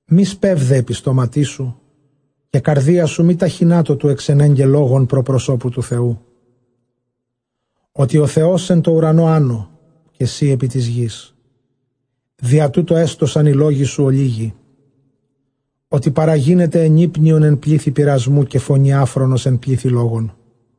Μὴ σπεῦδε ἐπὶ στόματί σου, καὶ καρδία σου μὴ ταχυνάτω τοῦ ἐξενέγκαι λόγον πρὸ προσώπου τοῦ Θεοῦ· ὅτι ὁ Θεὸς ἐν τῷ οὐρανῷ ἄνω, καὶ σὺ ἐπὶ τῆς γῆς· διὰ τοῦτο ἔστωσαν οἱ λόγοι σου ὀλίγοι. Ὅτι παραγίνεται ἐνύπνιον ἐν πλήθει πειρασμοῦ, καὶ φωνὴ ἄφρονος ἐν πλήθει λόγων.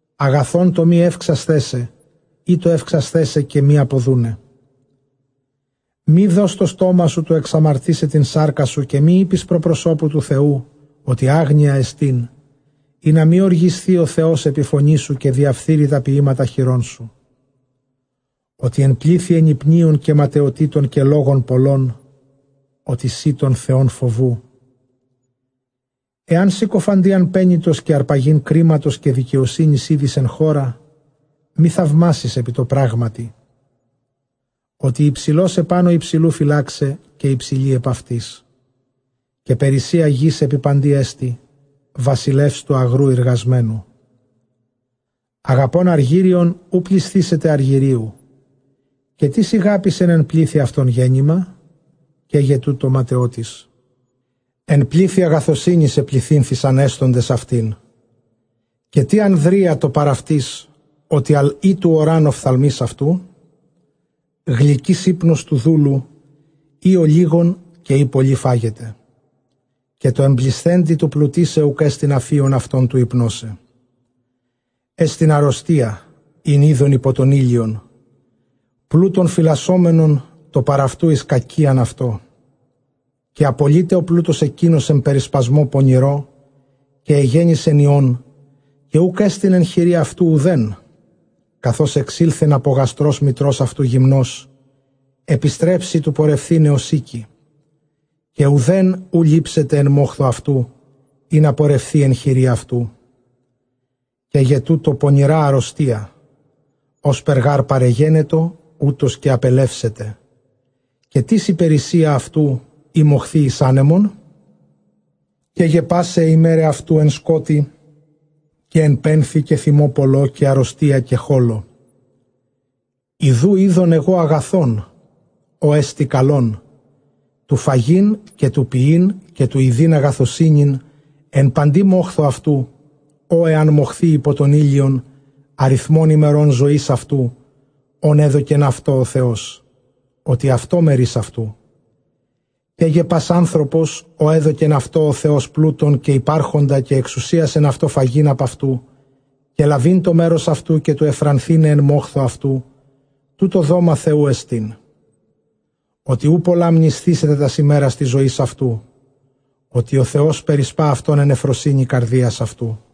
Ἀγαθὸν τὸ μὴ εὔξασθαί σε, ἢ τὸ εὔξασθαί σε καὶ μὴ ἀποδοῦναι. Μὴ δῷς τὸ στόμα σου τοῦ ἐξαμαρτῆσαι τὴν σάρκα σου, καὶ μὴ εἴπῃς πρὸ προσώπου τοῦ Θεοῦ, ὅτι ἄγνοιά ἐστιν· ἵνα μὴ ὀργισθῇ ὁ Θεὸς ἐπὶ φωνῇ σου, καὶ διαφθείρῃ τὰ ποιήματα χειρῶν σου. Ὅτι ἐν πλήθει ἐνυπνίων καὶ ματαιοτήτων καὶ λόγων πολλῶν, ὅτι σὺ τὸν Θεὸν φοβοῦ. Ἐὰν συκοφαντίαν πένητος καὶ ἁρπαγὴν κρίματος καὶ δικαιοσύνης ἴδῃς ἐν χώρᾳ, μὴ θαυμάσῃς ἐπὶ τῷ πράγματι· ὅτι ὑψηλὸς ἐπάνω ὑψηλοῦ φυλάξαι, καὶ ὑψηλοὶ ἐπʼ αὐτοῖς. Καὶ περίσσεια γῆς ἐπὶ παντί ἐστι, βασιλεὺς τοῦ ἀγροῦ εἰργασμένου. Ἀγαπῶν ἀργύριον οὐ πλησθήσεται ἀργυρίου· καὶ τίς ἠγάπησεν ἐν πλήθει αὐτῶν γέννημα; καί γε τοῦτο ματαιότης. Ἐν πλήθει ἀγαθωσύνης ἐπληθύνθησαν ἔσθοντες αὐτήν· καὶ τί ἀνδρεία τῷ παρʼ αὐτῆς; ὅτι ἀρχὴ τοῦ ὁρᾷν ὀφθαλμοῖς αὐτοῦ. Γλυκὺς ὕπνος τοῦ δούλου εἰ ὀλίγον καὶ εἰ πολὺ φάγεται, καὶ τῷ ἐμπλησθέντι τοῦ πλουτῆσαι, οὐκ ἔστιν ἀφίων αὐτὸν τοῦ ὑπνῶσαι. Ἔστιν ἀῤῥωστία ἣν εἶδον ὑπὸ τὸν ἥλιον, πλοῦτον φυλασσόμενον τῷ παρʼ αὐτοῦ εἰς κακίαν αὐτῷ, καὶ ἀπολεῖται ὁ πλοῦτος ἐκεῖνος ἐν περισπασμῷ πονηρῷ, καὶ ἐγέννησεν υἱὸν, καὶ οὐκ ἔστιν ἐν χειρὶ αὐτοῦ οὐδέν. Καθὼς ἐξῆλθεν ἀπὸ γαστρὸς μητρὸς αὐτοῦ γυμνὸς, ἐπιστρέψει τοῦ πορευθῆναι ὡς ἥκει, καὶ οὐδὲν οὐ λήψεται ἐν μόχθῳ αὐτοῦ, ἵνα πορευθῇ ἐν χειρὶ αὐτοῦ. Καί γε τοῦτο πονηρὰ ἀῤῥωστία· ὥσπερ γὰρ παρεγένετο, οὕτως καὶ ἀπελεύσεται· καὶ τίς ἡ περίσσεια αὐτοῦ ᾗ μοχθεῖ εἰς ἄνεμον; Καί γε πᾶσαι αἱ ἡμέραι αὐτοῦ ἐν σκότει, καὶ ἐν πένθει, καὶ θυμῷ πολλῷ, καὶ ἀῤῥωστίᾳ, καὶ χόλῳ. Ἰδοὺ, εἶδον ἐγὼ ἀγαθὸν, ὅ ἐστι καλὸν, τοῦ φαγεῖν καὶ τοῦ πιεῖν καὶ τοῦ ἰδεῖν ἀγαθωσύνην ἐν παντὶ μόχθῳ αὐτοῦ, ᾧ ἐὰν μοχθῇ ὑπὸ τὸν ἥλιον ἀριθμὸν ἡμερῶν ζωῆς αὐτοῦ ὧν ἔδωκεν αὐτῷ ὁ Θεὸς, ὅτι αὐτὸ μερὶς αὐτοῦ. Καί γε πᾶς ἄνθρωπος ᾧ ἔδωκεν αὐτῷ ὁ Θεὸς πλοῦτον καὶ ὑπάρχοντα, καὶ ἐξουσίασεν αὐτῷ φαγεῖν ἀπʼ αὐτοῦ, καὶ λαβεῖν τὸ μέρος αὐτοῦ, καὶ τοῦ· εὐφρανθῆναι ἐν μόχθῳ αὐτοῦ, τοῦτο δόμα Θεοῦ ἐστιν. Ὅτι οὐ πολλὰ μνησθήσεται τὰς ἡμέρας τῆς ζωῆς αὐτοῦ, ὅτι ὁ Θεὸς περισπᾷ αὐτὸν ἐν εὐφροσύνῃ καρδίας αὐτοῦ.